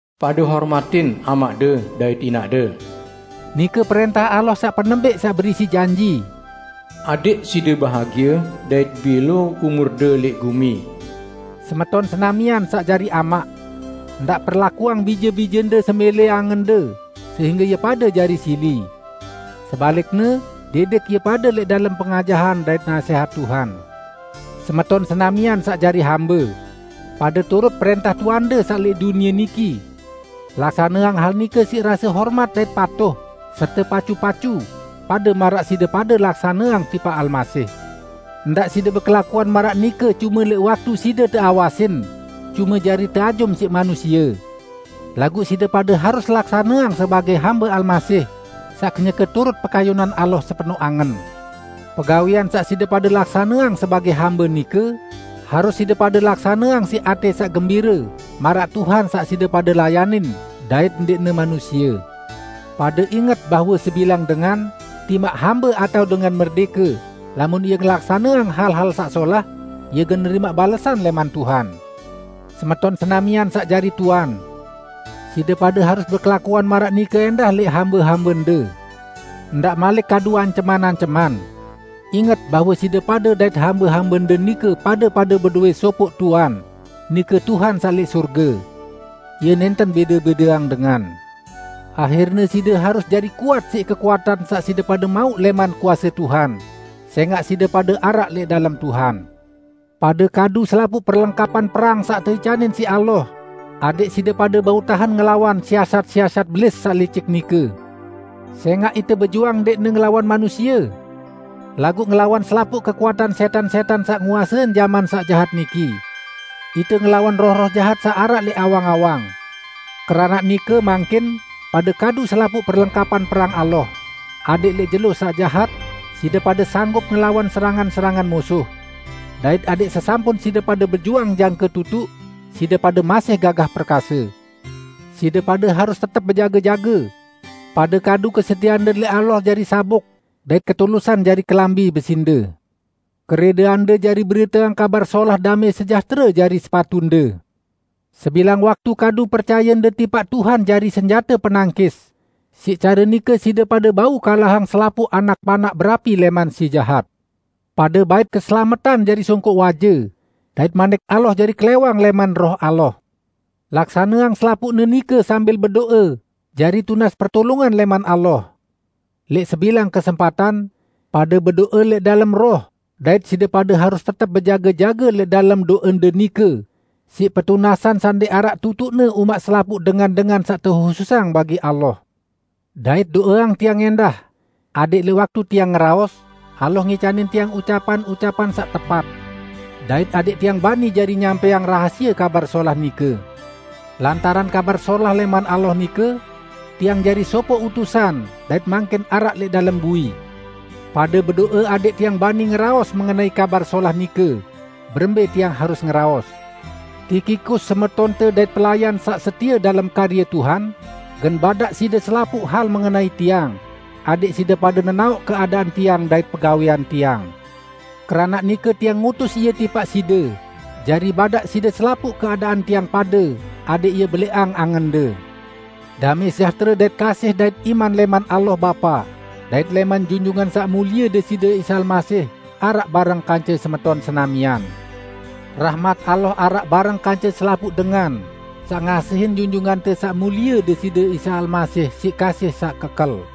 "Pade hormatin amaqde dait inaqde". Nike prẽntah Allah saq penembẽq saq berisi janji, "Adẽq side bahagie dait bẽlo umurde lẽq gumi." Semeton senamian saq jari amaq! Ndaq perlakuang bije-bijende semẽlẽ angende sehingge ie pade jari sili. Sebalikne, didik ie pade lẽq dalem pengajahan dait nasẽhat Tuhan. Semeton senamian saq jari hambe! Pade turut prẽntah tuande saq lẽq dunie niki. Laksaneang hal nike siq rase hormat dait patuh serte pacu-pacu, pade maraq side pade laksaneang tipaq Almasih. Ndaq side bekelakuan maraq nike cume lẽq waktu side teawasin, cume jari teajum siq manusie. Laguq side pade harus laksaneang sebagẽ hambe Almasih saq kenyeke turut pekayunan Allah sepenoq angen. Pegawẽan saq side pade laksaneang sebagẽ hambe nike, harus side pade laksaneang siq atẽ saq gembire maraq Tuhan saq side pade layanin, dait ndẽqne manusie. Pade inget bahwe sebilang dengan, timaq hambe atao dengan merdẽke, lamun ie ngelaksaneang hal-hal saq solah, ie gen nerimaq balesan lẽman Tuhan. Semeton senamian saq jari tuan! Side pade harus bekelakuan maraq nike ẽndah lẽq hambe-hambende. Ndaq malik kadu anceman-anceman. Inget bahwe side pade dait hambe-hambende nike pade-pade bedowẽ sopoq Tuan, nike Tuhan saq lẽq sorge. Ie nẽnten bẽde-bẽdeang dengan. Ahirne, side harus jari kuat siq kekuatan saq side pade mauq lẽman kuase Tuhan, sẽngaq side pade araq lẽq dalem Tuhan. Pade kadu selapuq perlengkapan perang saq teicanin siq Allah, adẽq side pade bau tahen ngelawan siasat-siasat Belis saq licik nike. Sẽngaq ite bejuang ndẽqne ngelawan manusie, laguq ngelawan selapuq kekuatan sẽtan-sẽtan saq nguasein jaman saq jahat niki. Ite ngelawan roh-roh jahat saq araq lẽq awang-awang. Keranaq nike, mangkin, pade kadu selapuq perlengkapan perang Allah, adẽq lẽq jelo saq jahat, side pade sanggup ngelawan serangan-serangan musuh. Dait adẽq sesampun side pade bejuang jangke tutuq, side pade masih gagah perkase. Side pade harus tetep bejage-jage. Pade kadu kesetieande lẽq Allah jari sabuk, dait ketulusan jari kelambi besinde. Kerẽdeande jari beriteang Kabar Solah damẽ sejahtere jari sepatunde. Sebilang waktu kadu percayende tipaq Tuhan jari senjate penangkis, siq care nike side pade bau kalahang selapuq anak panaq berapi lẽman si jahat. Pade bait keselametan jari songkoq waje, dait Manik Allah jari klẽwang lẽman Roh Allah. Laksaneang selapuqne nike sambil bedo'e jari tunas pertulungan lẽman Allah. Lẽq sebilang kesempatan, pade bedo'e lẽq dalem Roh dait side pade harus tetep bejage-jage lẽq dalem do'ende nike siq petunasan saq ndẽq araq tutuqne umaq selapuq dengan-dengan saq tehususang bagi Allah. Dait do'eang tiang ẽndah, adẽq lẽq waktu tiang ngeraos, Allah ngicanin tiang ucapan-ucapan saq tepat. Dait adẽq tiang bani jari nyampẽang rahasie Kabar Solah nike. Lantaran Kabar Solah lẽman Allah nike, tiang jari sopoq utusan, dait mangkin araq lẽq dalem bui. Pade bedo'e adẽq tiang bani ngeraos mengenai Kabar Solah nike, berembẽ tiang harus ngeraos. Tikikus, semetonte dait pelayan saq setie dalem karye Tuhan, gen badaq side selapuq hal mengenai tiang, adẽq side pade nenaoq keadaan tiang dait pegawẽan tiang. Keranaq nike tiang ngutus ie tipaq side, jari badaq side selapuq keadaan tiang pade, adẽq ie belẽqang angende. Damẽ sejahtere dait kasih dait iman lẽman Allah, Bapa dait lẽman Junjungan Saq Mulie Deside Isa Almasih araq bareng kance semeton senamian. Rahmat Allah araq bareng kance selapuq dengan saq ngasihin Junjungante Saq Mulie Deside Isa Almasih siq kasih saq kekel.